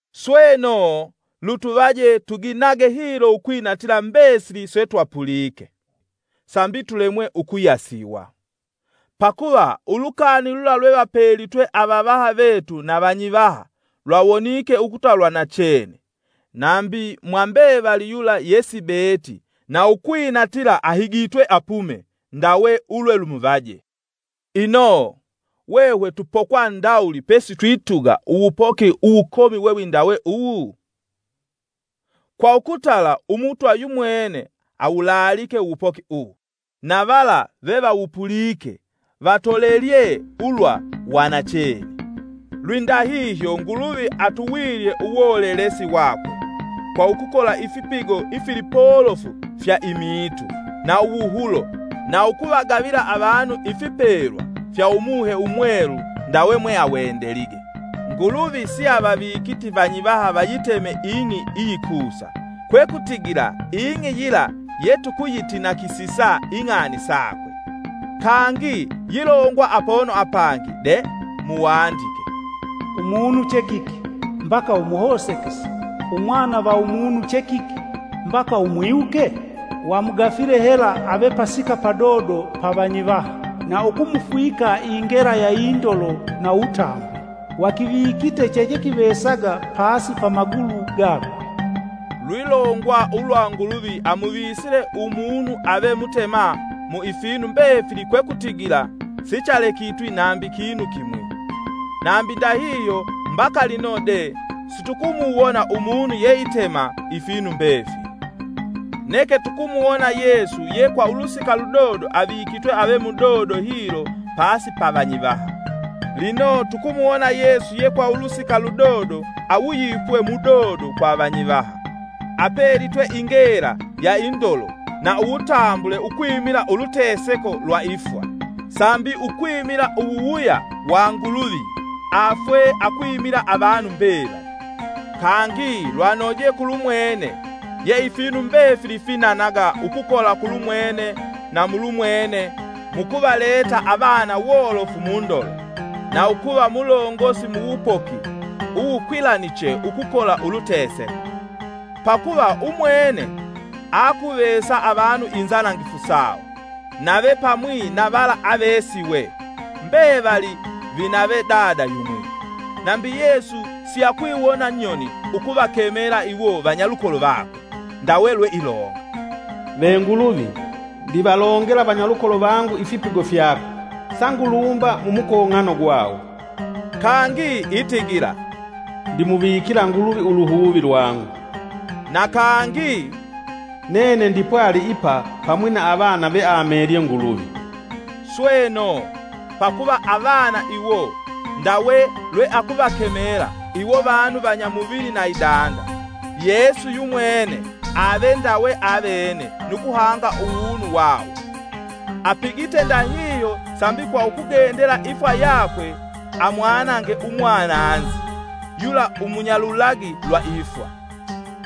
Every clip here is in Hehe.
Sweno lutuvaje tuginage hilo ukwinatila mbesili setwapulike, sambi tulemwe ukuyasiwa. Pakuva ulukani lula lwevapelitwe avavaha vetu na vanyivaha, lyawonike ukuta lwanachene, nambi mwa mbevali yula yesibeeti na ukwinatila ahigitwe apume ndawe ulwelumuvaje. Ino, hwehwe tupokwa ndawuli pesitwituga uwupoki uwukomi we windawe uwu? Kwa ukutala Umutwa yumwene awulaalike uwupoki uwu, na vala vevawupulike vatolelelye ulwa wa nachene. Lwindahihyo Nguluvi atuwilye uwolelesi wakwe, kwa ukukola ifipigo ifilipolofu fya imiitu na uwuhulo, na ukuvagavila avanu ifipelwa fya Umuhe Umwelu ndawe mweawendelige. Nguluvi siavavikiti vanyivaha vayitema ing'i iyikusa, kwekutigila ing'i yila yetukuyitinakisisa ing'ani sakwe. Kangi yilongwa apono apangi de, muwandike: “Umunu che kiki, mbaka umuhosekese, umwana va umunu che kiki, mbaka umwiwuke? Wamugafile hela ave pasika padodo pa vanyivaha; na ukumufwika ingela ya indolo na uwutambule, Wakivikite chechekivesaga pasi pa magulu gakwe.” Lwilongwa ulwa Nguluvi amuvisile umunu ave mutema mu ifinu mbefili kwekutigila sichalekitwi nambi kinu kimwi. Nambi ndahihyo mbaka lino de, situkumuwona umunu yeitema ifinu mbefili. Neke tukumuwona Yesu ye kwa ulusika ludodo avikitwe ave mudodo hilo pasi ya vanyivaha. Lino tukumuwona Yesu ye kwa ulusika ludodo awuyipwe mudodo kwa avanyivaha, apelitwe ingela ya indolo na uwutambule ukwimila uluteseko lwa ifwa, sambi ukwimila uwuwuya wa Nguluvi afwe akwimila avanu mbevali. Kangi lwanoje kulumwene, ye ifinu mbefili finanaga ukukola kulumwene na mulumwene mukuvaleta avana wolofu mundolo, na ukuva mulongosi muwupoki uwukwilaniche ukukola uluteseko. Pakuva Umwene aakuvesa avanu inzanangifu sawo, nave pamwi na vala avesiwe, mbevali vinave Dada yumwi. Nambi Yesu siakwiwona nyoni ukuvakemela iwo vanyalukolo vakwe; Ndawe lweilonga: “Ve Nguluvi, ndivalongela vanyalukolo vangu ifipigo fyako. Sangulumba mumukong'ano gwawo.” Kangi itigila: “Ndimuvikila Nguluvi uluhuvi lwangu.” Na kangi: “Nene ndipwali ipa pamwi na avana veamelye Nguluvi.” Sweno, pakuva avana iwo, ndawe lweakuvakemela, iwo vanu vanya muvili na idanda, Yesu yumwene ave ndawe avene nu kuhanga uwunu wawo. Apigite ndahihyo sambi kwa ukugendela ifwa yakwe amwanange umwananzi, yula umunyalulagi lwa ifwa.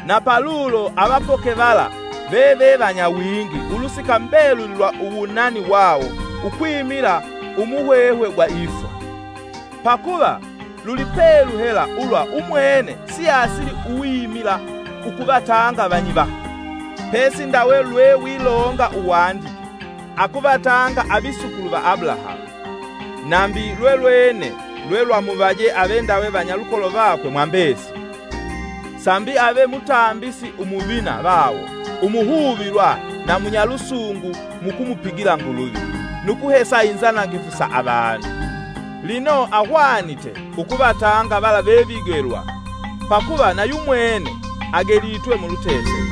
Na palulo avapoke vala veve vanyawingi ulusika mbeluli lwa uwunani wawo ukwimila umuhwehwe gwa ifwa. Pakuva lulipelu hela ulwa umwene siasili uwimila ukuvatanga vanyivaha, pesi ndawe lwewilonga uwandike, “Akuvatanga avisukulu va Abulahamu.” Nambi lwelwene lwelwamuvaje ave ndawe vanyalukolo vakwe mwa mbesili, sambi ave Mutambisi Umuvina vawo umuhuvilwa na munyalusungu mukumupigila Nguluvi, nukuhesa inzanangifu sa avanu. Lino ahwanite ukuvatanga vala vevigelwa, pakuva nayumwene agelitwe muluteseko.